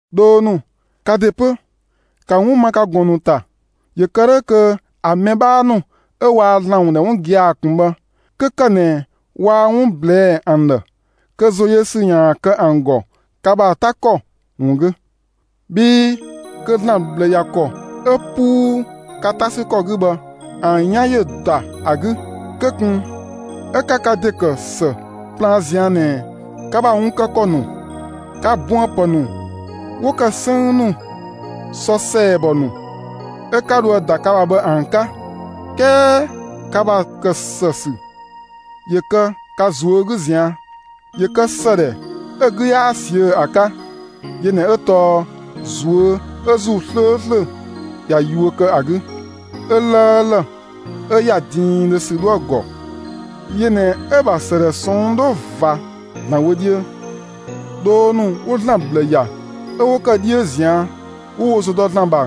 Dhoo ‑nu, ka ‑de 'pö, ‑ka 'wun ma ka ꞊gɔn ‑nu ‑ta! ‑Yö kë 'dhö kö ‑a mɛ 'bhaa ‑nu 'ö waa ‑Zlan ‑wun ‑dhɛ 'wun gia‑ ꞊kun bhë, 'kö ‑kë ꞊nɛ waa 'wun ꞊blɛɛ' ‑an ‑dhë, kö ‑zoyösü ‑yaan kë ‑an ‑gɔ ka ‑bha 'ta ‑kɔ ‑wun 'gü. Bhii kö ‑Zlan ꞊bhlë ‑ya ‑kɔ 'ö 'puu ka 'ta ‑sü ‑kɔ 'gü bhë, ‑an 'yan ‑yö ‑da ‑a 'gü. Kö ꞊kun 'ö 'ka ka ‑de ‑kë ‑së plaan ꞊zian' ꞊nɛ ka ‑bha wun kë ‑kɔ ‑nu, ka buënpë ‑nu 'wo ‑kë 'sënng ‑nu, sɔ ‑sɛɛbɔ ‑nu 'ö 'ka dhoë‑ ‑da ka ‑bha bhë ‑an 'ka! 'Kɛɛ ka ‑bha ‑kë ‑së ‑sü ‑yö kë ka ꞊zuö' 'gü ꞊zian'. ‑Yö kë ‑së ‑dhɛ 'ö‑ 'gü 'yaa ꞊siö' ‑a 'ka; yö ꞊nɛ 'ö tɔɔ ꞊zuö' ('ö ‑Zuu 'slööslö ꞊ya yuö kë ‑a 'gü), 'ö 'lëëlë, 'ö ‑ya diindhö ‑sü 'dhoë‑ ‑gɔ; yö ꞊nɛ 'ö‑ ‑bha ‑sëdhɛ ꞊sɔnng' 'dhö ꞊va ‑Zlan wö 'dhiö. Dhoo ‑nu 'wo ‑Zlan ꞊bhlë ‑ya 'ö 'wo ‑kë 'dhiö ꞊zian', 'wo wo ‑zo dɔ ‑Zlan ‑bha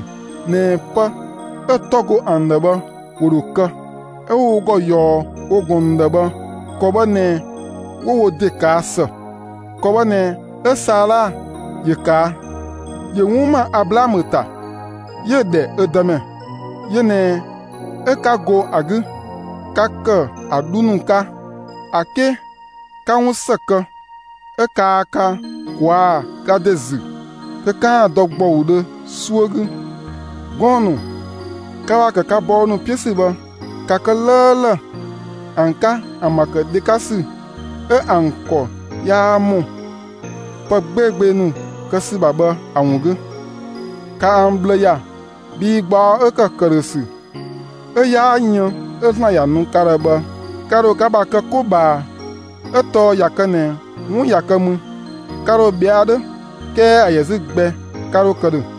(꞊nɛ pë 'ö‑ 'tɔ go ‑an ‑dhë bhë ‑wo ‑dho kë), 'ö 'wo wo ‑gɔ ꞊yɔɔ wo ꞊gɔn ‑nu ‑dhë bhë, ‑kɔ bhë ꞊nɛ 'wo wo ‑de ꞊kaa' ‑së. ‑Kɔ bhë ꞊nɛ 'ö Saala ‑yö ꞊kaa'. ‑Yö 'wun ‑ma Ablaamö ‑ta, 'yö‑ ‑dhɛ ö dëmɛ. Yö ꞊nɛ 'ö 'ka go ‑a 'gü, 'ka ‑kë ‑a 'dhu ‑nu 'ka, ‑a 'ke 'ka 'wun ‑së kë 'ö kaa ka ꞊kwaa' ka ‑de ‑zü kö 'kaan‑ dɔ ‑gbɔudhö 'suö 'gü. Gɔɔn‑ ‑nu, ka ‑bha ‑kë ka bɔɔ ‑nu 'piö ‑sü bhë, ‑ka kë 'lëëlë ‑an 'ka ‑an ‑bha ‑kë dhe 'ka ‑sü 'ö ‑an ‑kɔ 'yaa ‑mɔ pë 'gbeegbee ‑nu kë ‑sü ‑bha bhë ‑a ‑wun 'gü; ‑ka ‑an ꞊bhlë ‑ya, bhii gbaɔ 'ö ‑kë ‑këdhösü 'ö 'yaa yën 'ö ‑Zlan ‑ya nu ka ‑dhɛ bhɛ, ka ‑dho ka ‑bha kɛ 'ko ꞊bhaa. 'Ö tɔɔ ꞊ya kë ꞊nɛ 'wun ꞊ya kë mü, ka ‑dho ꞊bhɛa' 'dhö 'kɛɛ ‑a ‑yɛ 'zü gbɛ 'ka 'dho kë ‑dhö.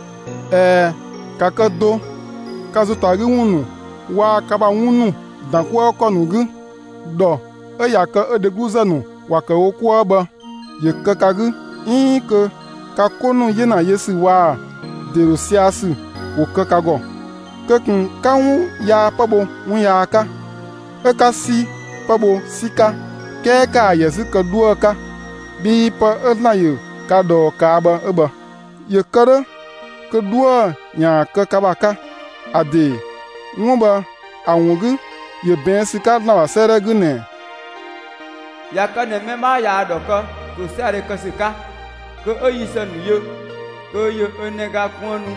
꞊Ɛɛ, ‑ka kë do ka ‑zo ‑ta 'gü ‑wun ‑nu waa‑ ka ‑bha 'wun ‑nu ‑dan 'kuë ‑kɔ ‑nu 'gü. ‑Dhɔ 'ö ꞊ya kë 'ö dhegluzë ‑nu ‑wa ‑kë wo 'kuë bhë ‑yö ‑ya ka 'gü 'iin kö ka 'ko ‑nu 'yena yö ‑sü waa‑ ‑de ‑dho sia‑ ‑sü ‑wo kë ka ‑gɔ. Kö ꞊kun 'ka 'wun yaa 'pë bho 'wun yaa 'ka, 'ö 'ka 'si 'pë bho 'si 'ka; 'kɛɛ ‑kaa ‑yɛ 'zü kë 'dhuë‑ 'ka, bhii pë 'ö ‑Zlan ‑yö ka ꞊dhɔɔ ꞊kaa' bhë 'ö bhë, ‑yö kë 'dhö kö 'dhuë‑ ‑yaan kë ka ‑bha 'ka. ‑A ‑de 'wun bhë ‑a ‑wun 'gü ‑yö ꞊bɛɛn' ‑sü 'ka ‑Zlan ‑bha 'sëëdhɛ 'gü ꞊nɛ: ꞊Ya kë ꞊nɛ mɛ 'bhaa ꞊yaa‑ ‑dhɔ kë ‑tosiadhe kë ‑sü 'ka, kö 'ö yi ‑së ‑nu yö, kö ‑yö 'ö nɛga kuënnu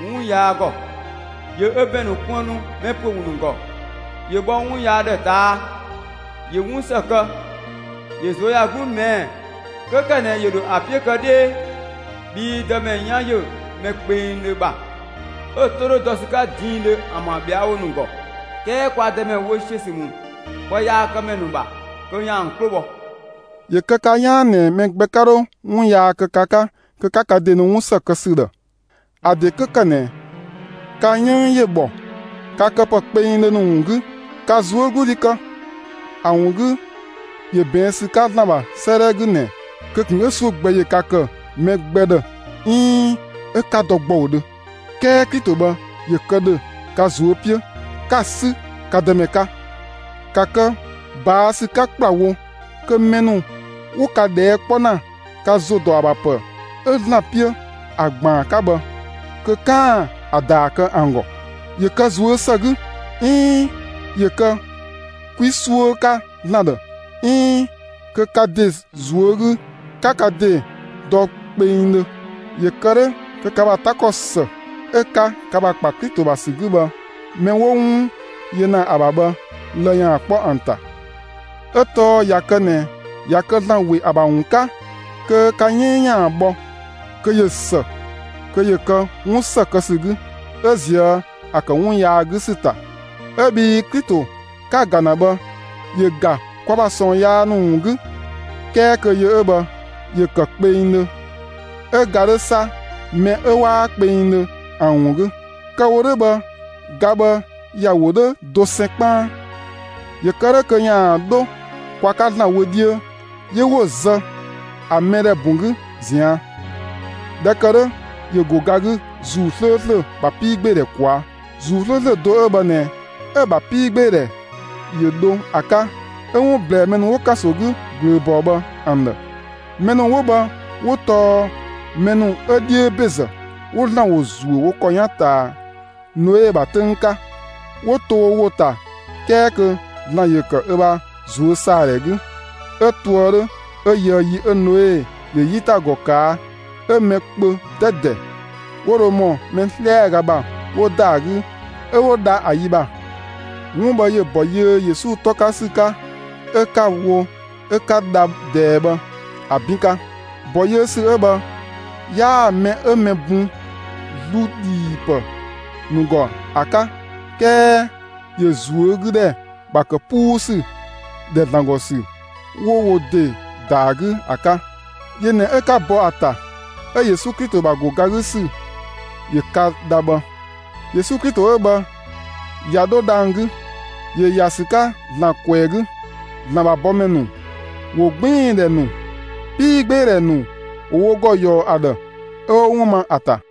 'wun yaa ‑gɔ; ‑yö ö ‑bɛn ‑nu kuënnu mɛ ‑püö ‑wun ‑nu ‑gɔ; ‑Yö bhɔ 'wun yaa ‑dhë ꞊taa', ‑yö 'wun ‑së kë; ‑yö ꞊zuöyagluu ꞊mɛɛ' 'kö ‑kë ꞊nɛ ‑yö ‑dho ‑a 'piö kë 'dhee. Bhii Dëmɛ 'yan ‑yö mɛ kpengdhö ‑bha, 'ö‑ 'to 'dhö dɔ ‑sü 'ka diindhö ‑an ‑bha ꞊bhɛawo ‑nu ‑gɔ. 'Kɛɛ kwa Dëmɛ wö ‑siö ‑sü ‑mü pëyaakëmɛ ‑nu ‑bha kö ‑yaan ‑an 'klo bhɔ. ‑Yö kë ka 'yaan ꞊nɛ mɛ gbɛ yaa 'dho 'wun yaa kë ka 'ka kö 'ka ka ‑de nu 'wun ‑së kë ‑sü ‑dhë. ‑A ‑de 'kö ‑kë ꞊nɛ ka 'yënng ‑yö ‑bhɔ ka këpë kpengdhö ‑nu ‑wun 'gü, ‑ka ꞊zuögludhi kë! ‑A ‑wun 'gü, ‑yö ꞊bɛɛn' ‑sü 'ka ‑Zlan ‑bha 'sëëdhɛ 'gü ꞊nɛ: Kö ꞊kun 'ö 'suö gbɛ ‑yö ka ‑kë mɛ gbɛ ‑dhë 'iin 'ö 'ka dɔ ‑gbɔudhö! 'Kɛɛ Klito bhë ‑yö kë ‑dhö ka ꞊zuö' 'piö, 'ka‑ 'sü ka Dëmɛ 'ka. ‑Ka kë ꞊baa' ‑sü 'ka ‑kplawo kö mɛ ‑nu 'wo ka ꞊dhɛɛ' 'kpɔ ‑na ka ‑zo ‑dɔ ‑a ‑bha ‑pë 'ö ‑Zlan 'piö ‑a ‑gbaan 'ka bhë, kö 'kaan‑ ‑a ‑daa kë ‑an ‑gɔ; ‑yö kë ꞊zuö' ‑së 'gü, 'iin ‑yö kë 'kwi 'suö 'ka ‑Zlan ‑dhë, 'iin kö ka ‑de ꞊zuö' 'gü 'ka ka ‑de dɔ kpengdhö; ‑yö kë 'dhö kö ka ‑bha 'ta ‑kɔ ‑së 'ö‑ 'ka ka ‑bha ‑kpa Klito ‑bha ‑sü 'gü bhë, mɛ 'wo 'wun yö ‑na ‑a ‑bha bhë, lë‑ ‑yaan 'kpɔ ‑an ‑ta. 'Ö tɔɔ ꞊ya kë ꞊nɛ ꞊ya kë ‑Zlan ‑we ‑a ‑bha ‑wun 'ka kö ka 'yënng ‑yaan bhɔ, kö ꞊yö ‑së kö ‑yö kë 'wun ‑së kë ‑sü 'gü 'ö ꞊zië' ‑a ‑kë 'wun yaa 'gü ‑sü ‑ta. 'Ö bhii Klito 'ka‑ ‑ga ‑na bhë, ‑yö ‑ga kwa ‑bha ꞊sɔɔn yaa ‑nu ‑wun 'gü; 'kɛɛ kö yö 'ö bhë ‑yö ‑kë kpengdhö, 'ö ga 'dhö 'sa mɛ 'ö 'waa kpengdhö ‑an ‑wun 'gü. Kë‑ wo 'dhö bhë, ga bhë ‑ya wo 'dhö dosɛn 'kpaan; ‑yö kë 'dhö kö ‑yaan 'dho kwa 'ka ‑Zlan wö 'dhiö; 'yö 'wo‑ zë ‑a mɛdhɛ ‑bun 'gü ꞊zian'. ꞊Dhɛ ‑kë 'dhö ‑yö ‑go ga 'gü ‑Zuu 'slööslö ‑bha 'piigbeedhɛ ꞊kwaa'. ‑Zuu 'slööslö do 'ö bhë ꞊nɛ 'ö‑ ‑bha 'piigbeedhɛ ‑yö dho ‑a 'ka 'ö 'wun ꞊blɛɛ mɛ ‑nu 'wo ‑kanso 'gü ꞊glööbɔɔ bhë ‑an ‑dhë. Mɛ ‑nu 'wo bhë 'wo tɔɔ mɛ ‑nu 'ö 'dhiö ‑bezë, 'wo ‑Zlan ‑wo ‑zuö ‑kɔ 'yan ꞊taa Noe ‑bha 'töng 'ka; 'wo to wo ‑wo ‑ta 'kɛɛ kö ‑Zlan ‑yö ‑kë ö ‑bha ꞊zuösaadhɛ 'gü; 'ö toë 'dhö 'ö yöë yi 'ö Noe ‑yö 'yitagɔ ꞊kaa' 'ö mɛ kpö 'dɛdɛ 'wo dho ‑mɔ mɛ 'slɛaga ‑bha 'wo ‑da ‑a 'gü 'ö 'wo dha ‑a ‑yi ‑bha. 'Wun bhë ‑yö ‑bɔ yiö Yesu 'tɔ 'ka ‑sü 'ka 'ö 'ka‑ wo 'ö 'ka dha ꞊dɛɛ bhë ‑a 'bin 'ka; ‑bɔ yiö ‑sü 'ö bhë 'yaa‑ mɛ 'ö mɛ bun ‑zlu ‑dhiipë ‑nu ‑gɔ ‑a 'ka 'kɛɛ ‑yö ꞊zuögüdhɛ ‑bha ‑kë 'puu ‑sü ‑dhɛ ‑Zlan ‑gɔ ‑sü 'wo wo ‑de ‑da ‑a 'gü ‑a 'ka; yö ꞊nɛ 'ö 'ka bɔ ‑a ‑ta 'ö Yesu Klito ‑bha ‑go ga 'gü ‑sü ‑yö ka dha bhë. Yesu Klito 'ö bhë ꞊ya 'dho dhang‑ 'gü. ‑Yö ‑ya ‑sü 'ka ‑Zlan ꞊kwɛɛ‑ 'gü. ‑Zlan ‑bha bɔmɛ ‑nu, ‑wogbiindhɛ ‑nu, 'piigbeedhɛ ‑nu ‑wo wo ‑gɔ ‑yɔɔ ‑a ‑dhë, 'ö 'wo 'wun ma ‑a ‑ta.